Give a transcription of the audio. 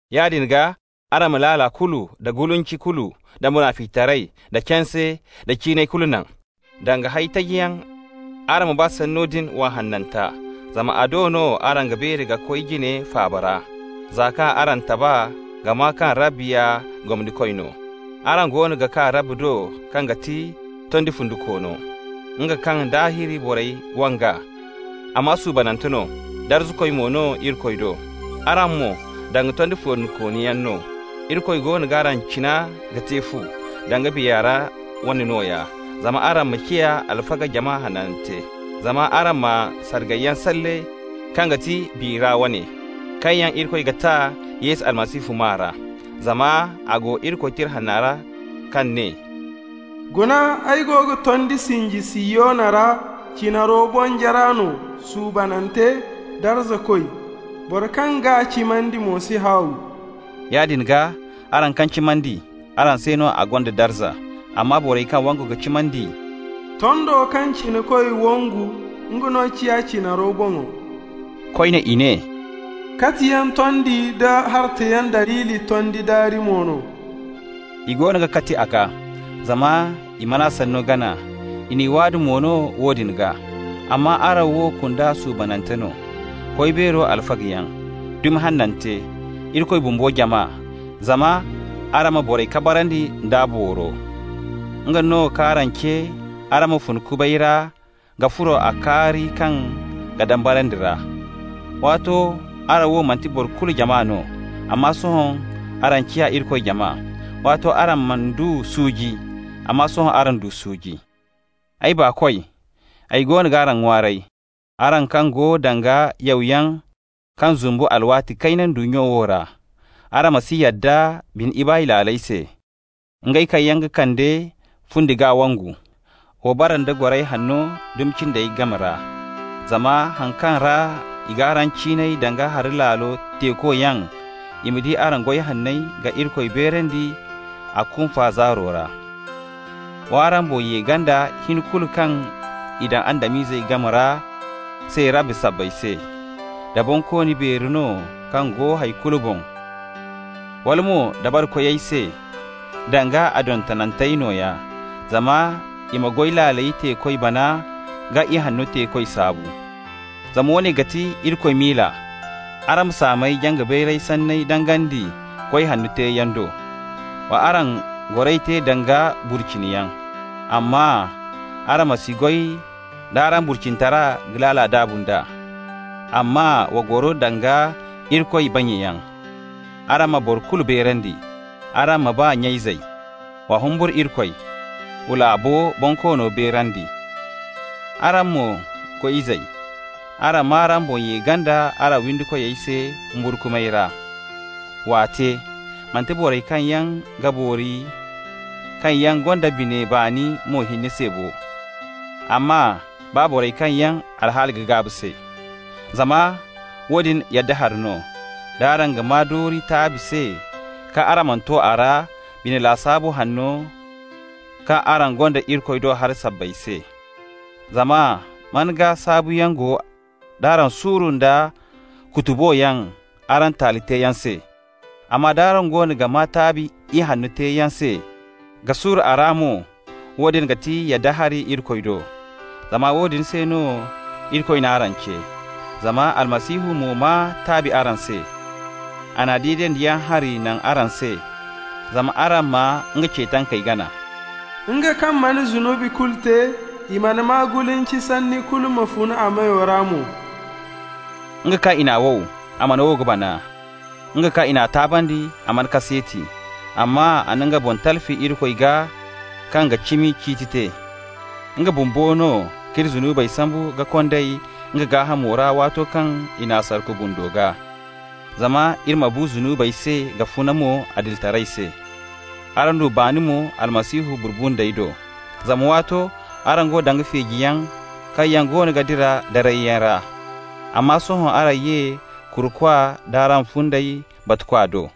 Yaadin gaa, araŋ ma laala kulu, da gulinci kulu, da munaficitaray, da canse, da ciinay kulu naŋ. Danga hay tajiyaŋ, araŋ ma ba sanno din wa hananta, zama a do no araŋ ga beeri ka koy jina faaba ra, za kaŋ araŋ taba ka maa kaŋ Rabbi ya gomnikoy no. Araŋ goono ga kaa Rabbi do kaŋ ga ti tondi fundikoono, nga kaŋ daahir borey wang'a, amma suubanante no, darzakoy mo no Irikoy do. Araŋ mo, danga tondi fundikooniyaŋ no, Irikoy goono g'araŋ cina ka te fu, danga biya ra wane nooya, zama araŋ ma ciya alfaga jama hanante. Zama araŋ ma sargayyaŋ salle, kaŋ ga ti biya ra wane, kaŋ yaŋ Irikoy ga ta Yesu Almasihu maa ra. Zama a go Irikoy Tira Hanna ra, kaŋ ne: «Guna, ay go ga tondi sinji Sihiyona ra, cinaro bonjara no, suubanante, darzakoy. Boro kaŋ g'a cimandi mo si haaw.» Yaadin gaa, araŋ kaŋ cimandi, araŋ se no a gonda darza. Amma borey kaŋ wangu ka cimandi: «Tondo kaŋ cinakoy wangu, nga no ciya cinaro boŋo.» Koyne i ne: «Katiyaŋ tondi nda hartayaŋ daliili tondi daari mo no.» I goono ga kati a gaa, zama i mana sanno gana, i n'i waadu mo no woodin gaa. Amma araŋ wo kunda suubanante no, Koy Beero alfagayaŋ, dumi hanante, Irikoy bumbo jama, zama araŋ ma borey kabarandi nd'a booro. Nga no k'araŋ ce araŋ ma fun kubay ra ka furo a kaari kaŋ ga dambarandi ra. Waato araŋ wo manti boro kulu jama no, amma sohõ araŋ ciya Irikoy jama. Waato araŋ mana du suuji, amma sohõ araŋ du suuji. Ay baakoy, ay goono g'araŋ ŋwaaray, araŋ kaŋ go danga yawyaŋ kaŋ zumbu alwaati kayna ndunnya wo ra: araŋ ma si yadda bine ibaay laaley se, ngey kaŋ yaŋ ga kande fundi gaa wongu. Wa bara nda goray hanno dumi cindey game ra, zama haŋ kaŋ ra i g'araŋ ciinay danga hari laalo teekoyaŋ, i ma di araŋ goy hanney ka Irikoy beerandi a kunfa zaaro ra. W'araŋ boŋ ye ganda hin kulu kaŋ i daŋ Adam-ize game ra se Rabbi sabbay se, da bonkooni beeri no kaŋ go hay kulu boŋ, wala mo dabarikoyey se, danga a dontonantey nooya, zama i ma goy laaley teekoy bana ka ihanno teekoy saabu. Zama woone ga ti Irikoy miila: araŋ ma saamey jaŋ-ka-bayra sanney dangandi goy hanno teeyaŋ do. Wa araŋ goray te danga burciniyaŋ, amma araŋ ma si goy d'araŋ burcinitara ka laala daabu nd'a, amma wa goro danga Irikoy bannyayaŋ. Araŋ ma boro kulu beerandi. Araŋ ma ba nya-izey. Wa humburu Irikoy. Wa laabo bonkoono beerandi. Araŋ mo, goy-izey, araŋ m'araŋ boŋ ye ganda araŋ windi koyey se humburkumay ra. W'a te, manti borey kaŋ yaŋ ga boori kaŋ yaŋ gonda bine baani mo hinne se bo, amma baa borey kaŋ yaŋ alhaali ga gaabu se. Zama woodin yadda hari no, d'araŋ ga maa doori taabi se kaŋ araŋ mana to r'a bine lasaabu hanno kaŋ araŋ gonda Irikoy do haray sabbay se. Zama man gaa saabuyaŋ go d'araŋ suuru nda kutuboyaŋ araŋ taali teeyaŋ se? Amma d'araŋ goono ga maa taabi ihanno teeyaŋ se ka suuru a ra mo, woodin ga ti yadda hari Irikoy do. Zama woodin se no Irikoy n'araŋ ce. Zama Almasihu mo maa taabi araŋ se. A na deedandiyaŋ hari naŋ araŋ se, zama araŋ ma nga ce tankey gana. «Nga kaŋ mana zunubi kulu te, i mana maa gulinci sanni kulu ma fun a meyo ra mo.» Nga kaŋ i n'a wow, a mana wow ka bana. Nga kaŋ i n'a taabandi, a mana kaseeti, amma a na nga boŋ talfi Irikoy gaa kaŋ ga cimi ciiti te. Nga bumbo no k'iri zunubey sambu ka kond'ey nga gaahamo ra waato kaŋ i n'a sarku bundo gaa, zama iri ma bu zunubey se ka funa mo adilitaray se. Araŋ du baani mo Almasihu burbundey do. Zama waato araŋ go danga feejiyaŋ kaŋ yaŋ goono ga dira darayyaŋ ra, amma sohõ araŋ ye Kurukwa d'araŋ fundey Batukwa do.